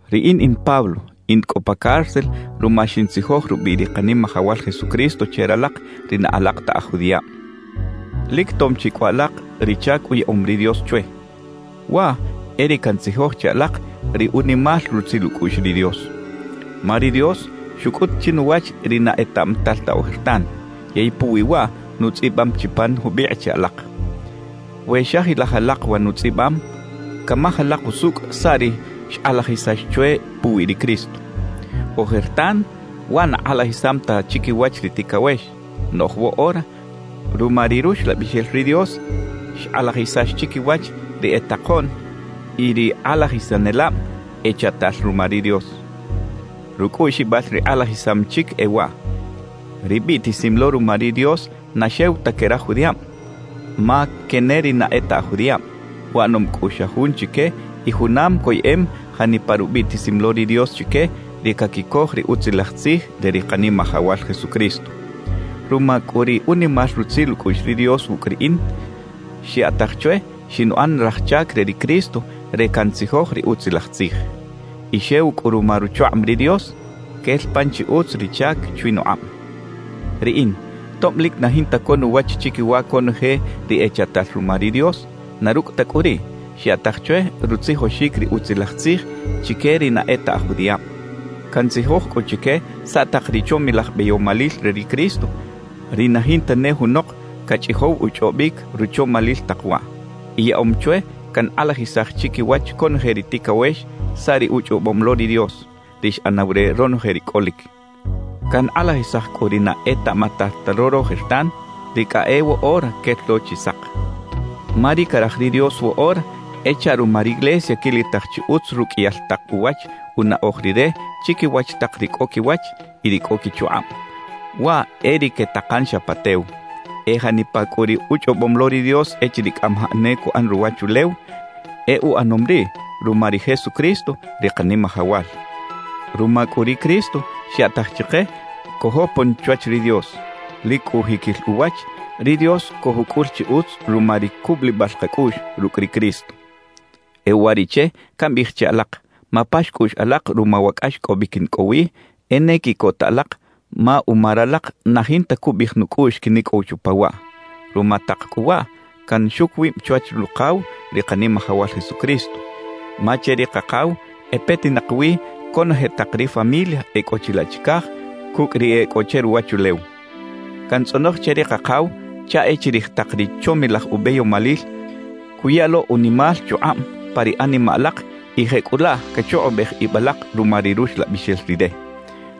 Riꞌin in Pablo, in cꞌo pa cárcel ruma xintzijoj rubiꞌ ri Kanimajawal Jesucristo che ralak ri na alak ta aj judiꞌab. Lic tom chi cꞌu alak ri chac uyaꞌom ri Dios chwe: Waꞌ e ri cantzijoj che alak ri unimal rutzil ucꞌuꞌx ri Dios. Ma ri Dios xucꞌut chinuwach ri na etaꞌmatal ta ojertan, yey puwi waꞌ nutzꞌibam chi pan jubikꞌ che alak. We xajilaj alak wa nutzꞌibam, camaj alak usucꞌ saꞌ ri xkꞌalajisax chwe puwi ri Cristo. Ojertan waꞌ na kꞌalajisam ta chiquiwach ri ticawex; noꞌj woꞌora ruma ri Ruxlabixel ri Dios xkꞌalajisax chiquiwach ri e takoꞌn y ri kꞌalajisanelab echaꞌtal ruma ri Dios. Rucꞌuꞌxibal ri kꞌalajisam chic e waꞌ: Ri biꞌtisim lo ruma ri Dios na xew ta que raj judiꞌab, ma que ne ri na e ta aj judiꞌab; uꞌanom cꞌu xa jun chique y junam coyeꞌem janipa rubiꞌtisim lo ri Dios chique ri caquicoj ri Utzilaj Tzij re ri Kanimajawal Jesucristo. Ruma cꞌu ri unimal rutzil ucꞌuꞌx ri Dios wucꞌ riꞌin, xyaꞌtaj chwe xinuꞌan raj chac ri Cristo re cantzijoj ri Utzilaj Tzij. Y xew cꞌu ruma ruchukꞌab ri Dios, quel pan chi utz ri chac chwi nukꞌab. Riꞌin tob lic na jinta co nuwach chiquiwa conoje ri echaꞌtal ruma ri Dios; na rucꞌ ta cꞌu riꞌ, xyaꞌtaj chwe rutzijoxic ri Utzilaj Tzij chique ri na e ta aj judiꞌab. Cantzijoj cꞌu chique saꞌ tak ri chomilaj beyomalil re ri Cristo, ri na jinta ne junok cachꞌijow uchꞌobic ruchomalil tak waꞌ. Y yaꞌom chwe cankꞌalajisaj chiquiwach conoje ri ticawex saꞌ ri uchꞌobom lo ri Dios, ri xꞌanaw re ronoje ri cꞌolic. Cankꞌalajisaj cꞌu ri na etaꞌmatal ta lo rojertan, ri cꞌa e woꞌora quel lo chi sak. Ma ri caraj ri Dios woꞌora e chaꞌ ruma riglesia quilitaj chi utz ruqꞌuiyal tak uwach unaꞌoj Rire chiquiwach tak ri cꞌo quiwach y ri cꞌo quichukꞌab, waꞌ e ri quetakan xa pa tew. E janipa cꞌu ri uchꞌobom lo ri Dios echiriꞌ cꞌamajaꞌ ne cuꞌan ruwachulew, e uꞌanom riꞌ ruma ri Jesucristo, ri Kanimajawal. Ruma cꞌu ri Cristo xyaꞌtaj chike cojopon chwach ri Dios; lic cꞌu jiquil uwach, ri Dios cojucꞌul chi utz ruma ri cubulibal kacꞌuꞌx rucꞌ ri Cristo. E uwariꞌche cambiꞌij che alak, mapax cꞌuꞌx alak ruma wa cꞌaxcꞌobic in cꞌo wi, e ne quiꞌcota alak ma uma ralak na jinta cubiꞌij nucꞌuꞌx quinicꞌow chupa waꞌ. Ruma tak cꞌu waꞌ, canxuc wib chwach Rukaw ri Kanimajawal Jesucristo, ma che ri Kakaw e petinak wi conoje tak ri familia e cꞌo chilaꞌ chicaj cucꞌ ri e cꞌo che ruwachulew. Cantzꞌonoj che ri Kakaw chaꞌ e chirij tak ri chomilaj ubeyomalil, cuya lo unimal chukꞌab pa ri animaꞌ alak y jecꞌulaꞌ cachukꞌubej ib alak ruma ri Ruxlabixel Rire.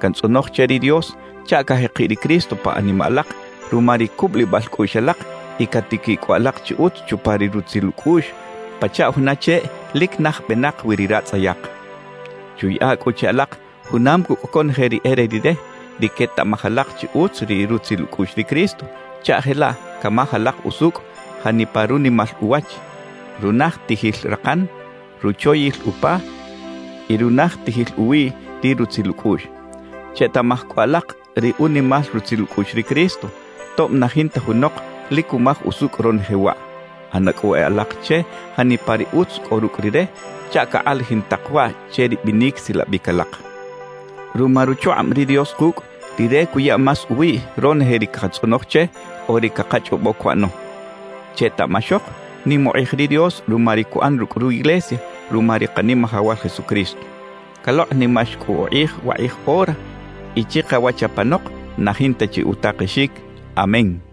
Cantzꞌonoj che ri Dios chaꞌ cajekiꞌ ri Cristo pa animaꞌ alak ruma ri cubulibal cꞌuꞌx alak y catiquiꞌ cꞌu alak chi utz chupa ri rutzil ucꞌuꞌx pachaꞌ juna cheꞌ lic naj benak wi ri ratzꞌayak. Chuyaꞌa cꞌu che alak junam cucꞌ conoje ri e re Rire, ri quetaꞌmaj alak chi utz ri rutzil ucꞌuꞌx ri Cristo chaꞌ jelaꞌ camaj alak usucꞌ janipa runimal uwach, runajtijil rakan, ruchoyil upa y runajtijil uwiꞌ ri rutzil ucꞌuꞌx. Chetaꞌmaj cꞌu alak ri unimal rutzil ucꞌuꞌx ri Cristo, tob na jinta junok lic cumaj usucꞌ ronoje waꞌ. ꞌAna cꞌu e alak che janipa ri utz cꞌo rucꞌ Rire chaꞌ cakꞌalajin tak waꞌ che ri binic silabic alak. Ruma ruchukꞌab ri Dios kucꞌ, Rire cuya más uwiꞌ ronoje ri cakatzꞌonoj che o ri cakachꞌobo cuꞌano. ¡Chetaꞌmaxok nim ukꞌij ri Dios ruma ri cuꞌan rucꞌ ru iglesia ruma ri Kanimajawal Jesucristo! Calokꞌnimax cꞌu ukꞌij wakꞌij ora y chikawach apanok na jinta chi utakexic. Amén.